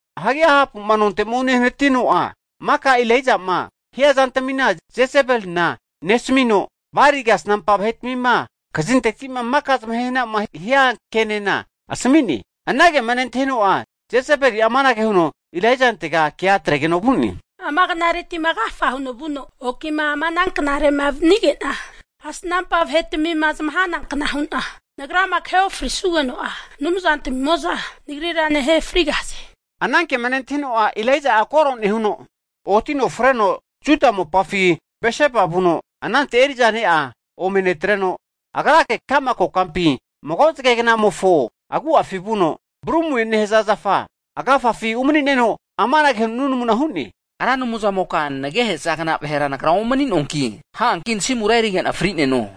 Hagi Ahapu'ma nonte'ma unehanatino'a, maka Elaija'ma hia zantamina Jesebelina nesamino, Bali kasnampa vahetmima kazinteti'ma maka zamahehna'ma hia kenena asami'ne. Anagema Jezebeli'a nentahino'a, amanage huno Elaijantega kea atregeno vu'ne. Ama knaretima agafa huno vuno oki'ma ama ana knare'ma vanige'na, kasnampa vahetmima zamahana hanankna hu'na nagrama kahe ofrisugeno'a, anumzantmimo'za nagrira nahe frigahaze. Higeno anankema Elaija'a nentahino'a, koro nehuno otino freno Juda mopafi Berseba vuno, anante eri'za ne'a ome netreno, agrake ka'ma kokampi mago zage knamofo agu'afi vuno, brumue nehaza zafa agafafi umani'neno amanage huno nunamuna hu'ne, Ra Anumzamoka nagehezagna vahera nagra omani'noanki, ha'anki nasimura erige'na fri'neno.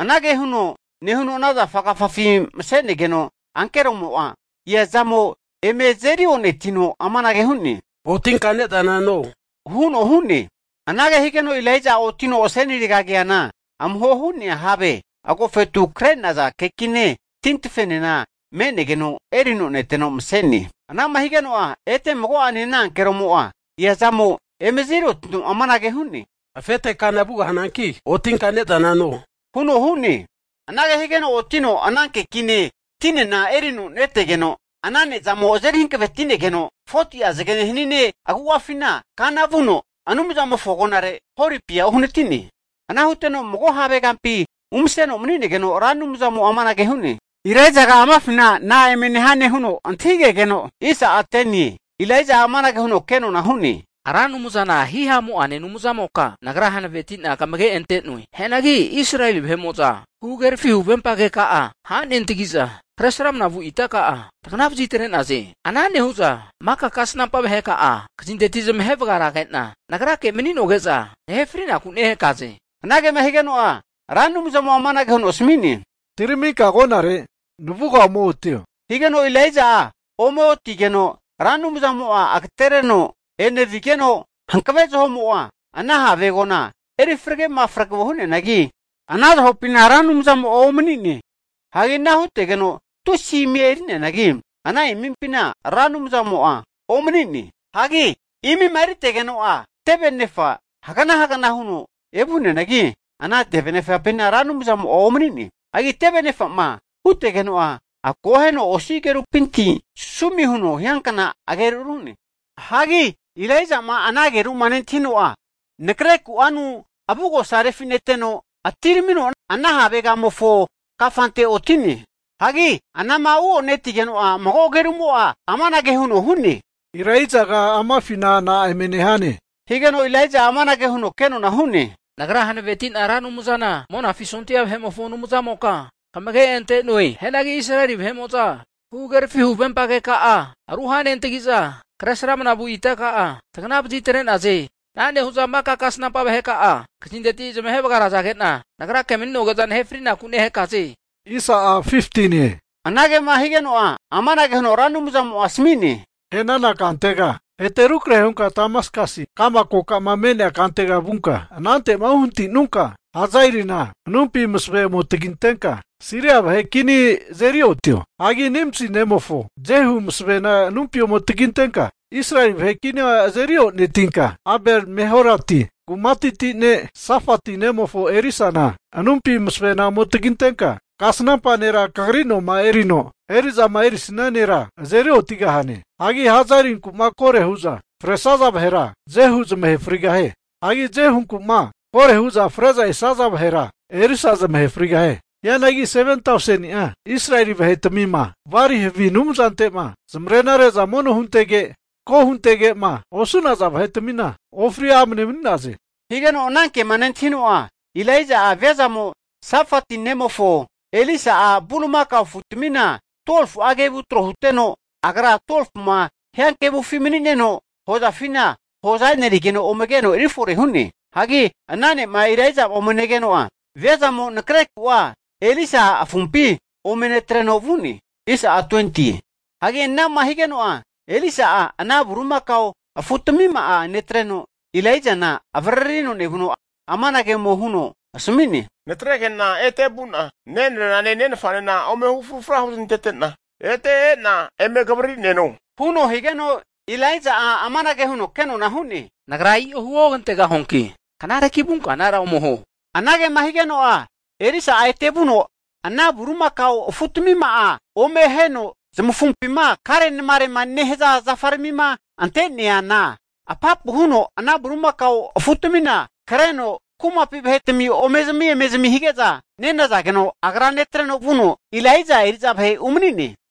Anage huno nehuno ana zafa agafafi mase'negeno ankeromo'a eazamo eme azeri o'netino amanage hu'ne, otinka ne'zana no, huno hu'ne. Anage higeno Elaija'a otino asenirega keana amuho hu'nea have agofetu kre'naza kekine, tintafena me'negeno erino neteno mase'ne. Ana'ma higeno'a ete mago'ane ana ankeromo'a eazamo eme azeri otino amanage hu'ne, Afete kana vugahananki otinka ne'zana no, huno hu'ne. Anage higeno otino ana kekine tinena erino netegeno, ana ne'zamo azeri hankavetinegeno 40'a zagene haninemofo agu'afi kana vuno, Anumzamofo agonare Horepia uhanati'ne. Ana huteno mago have kampi umaseno mani'negeno Ra Anumzamo'a amanage hu'ne, Elaijaga amafina na'a eme nehane? huno antahige'geno, Elaija'a amanage huno kenona hu'ne, Ra Anumzana hihamu'ane Anumzamoka, nagra hanaveti'na kamage ante'noe. Hianagi Israeli vahe'mo'za huhagerafi huvempa keka'a ruhanentagi'za, Kresramana vu itaka'a tagana vazitre'naze. Ana nehu'za maka kasnampa vaheka'a kazinteti zamahe vagarage'na nagrake mani'noge'za nahe fri'naku nehakaze. Anagema higeno'a Ra Anumzamo'a amanage huno asami'ne, Atiraminka agonare navuga ome otio, higeno Elaija'a ome otigeno Ra Anumzamo'a agatereno enevigeno, hankave zaho'mo'a ana have agona erifrage mafrege hu'neanagi, ana zahopina Ra Anumzamo'a omani'ne! Hagi ana hutegeno tusi imi eri'neanagi, ana imimpina Ra Anumzamo'a omani'ne. Hagi imima eritegeno'a, teve anefa'mo hagnahagna huno evu'neanagi, ana teve nefapina Ra Anumzamo'a omani'ne. Hagi teve anefa'ma evutegeno'a akoheno osi agerupinti sumi huno hiankna ageru ru'ne. Hagi Elaijama ana ageru'ma nentahino'a, nakre ku'anu avugosa refineteno, atiramino ana havegamofo kafante oti'ne. Hagi anama uotigeno'a mago ageru'mo'a amanage huno hu'ne. Elaijaga amafina na'a eme nehane? Higeno Elaija'a amanage huno kenona hu'ne, Nagra hanaveti'na Ra Anumzana Monafi sondia vahetamimofo Anumzamoka kamage ante'noe. Hianagi Israeli vahe'mo'za huhagerafi huvempa keka'a ruhanentagiza, Kresramana vu itaka'a tagana vazitre'naze. Ana nehu'za maka kasnampa vaheka'a kazinteti zamahe vagarazage'na nagrake mani'noge'za nahe fri'naku nehakaze. Anagema higeno'a amanage huno Ra Anumzamo'a asami'ne, E'nana kantega ete rukrahe hunka Damaskasi ka'ma kokama me'nea kantega vunka, anante'ma uhanati'nunka, Hazaelina anumpi masavena ome tagintenka Siria vahe kini azeri otio. Hagi Nimsi nemofo Jehuna masavena anumpi ome tagintenka Israeli vahe kinia azeri onetinka, Abel-meholati kumateti ne' Safati nemofo Elisana anumpi masavena ome tagintenka kasnampa nera kagri noma erino eri'zama erisia nera azeri otigahane. Hagi Hazaelinku'ma koro hu'za fresaza vahera Jehu zamahe frigahie. Hagi Jehunkuma koro hu'za freza esaza vahera Elisa zamahe frigahie. Hianagi 7tauseni'a Israeli vahetmima Bali havi anumzante'ma zamare'na re'za mono huntege, antako huntege'ma osu'naza vahetmina ofri amne mani'naze. Higeno ananke'ma nentahino'a, Elaija'a viazamo Safati nemofo Elisa'a bulimakao afutamina 12fu'a kevu tro huteno, agra 12fuma hiankevufi mani'neno hozafina hoza e'nerigeno ome keno eri fore hu'ne. Hagi ana ne'ma Elaija'a ome negeno'a, viazamo nakreku'a Elisa afumpi ome netreno vu'ne. Hagi ana'ma higeno'a, Elisa'a ana bulimakao afutmima'a netreno, Elaijana avaririno nevuno amanage ome huno asami'ne, Natrege'na ete vu'na nenrerane nenfanena ome hufru huzmantete'na ete e'na eme kavaririneno huno higeno, Elaija'a amanage huno kenona hu'ne, Nagra i'o huogantegahuanki knareki vunka anara ome huo. Anagema higeno'a Elisa'a ete vuno ana bulimakao afutmima'a ome aheno zamafumpima kare namarema nehaza zafarami ante'neana apapu huno ana bulimakao afutamina kreno ana kumapi vahetami ome zami, eme zami hige'za nenazageno, agra netreno vuno Elaija eri'za vahe umani'ne.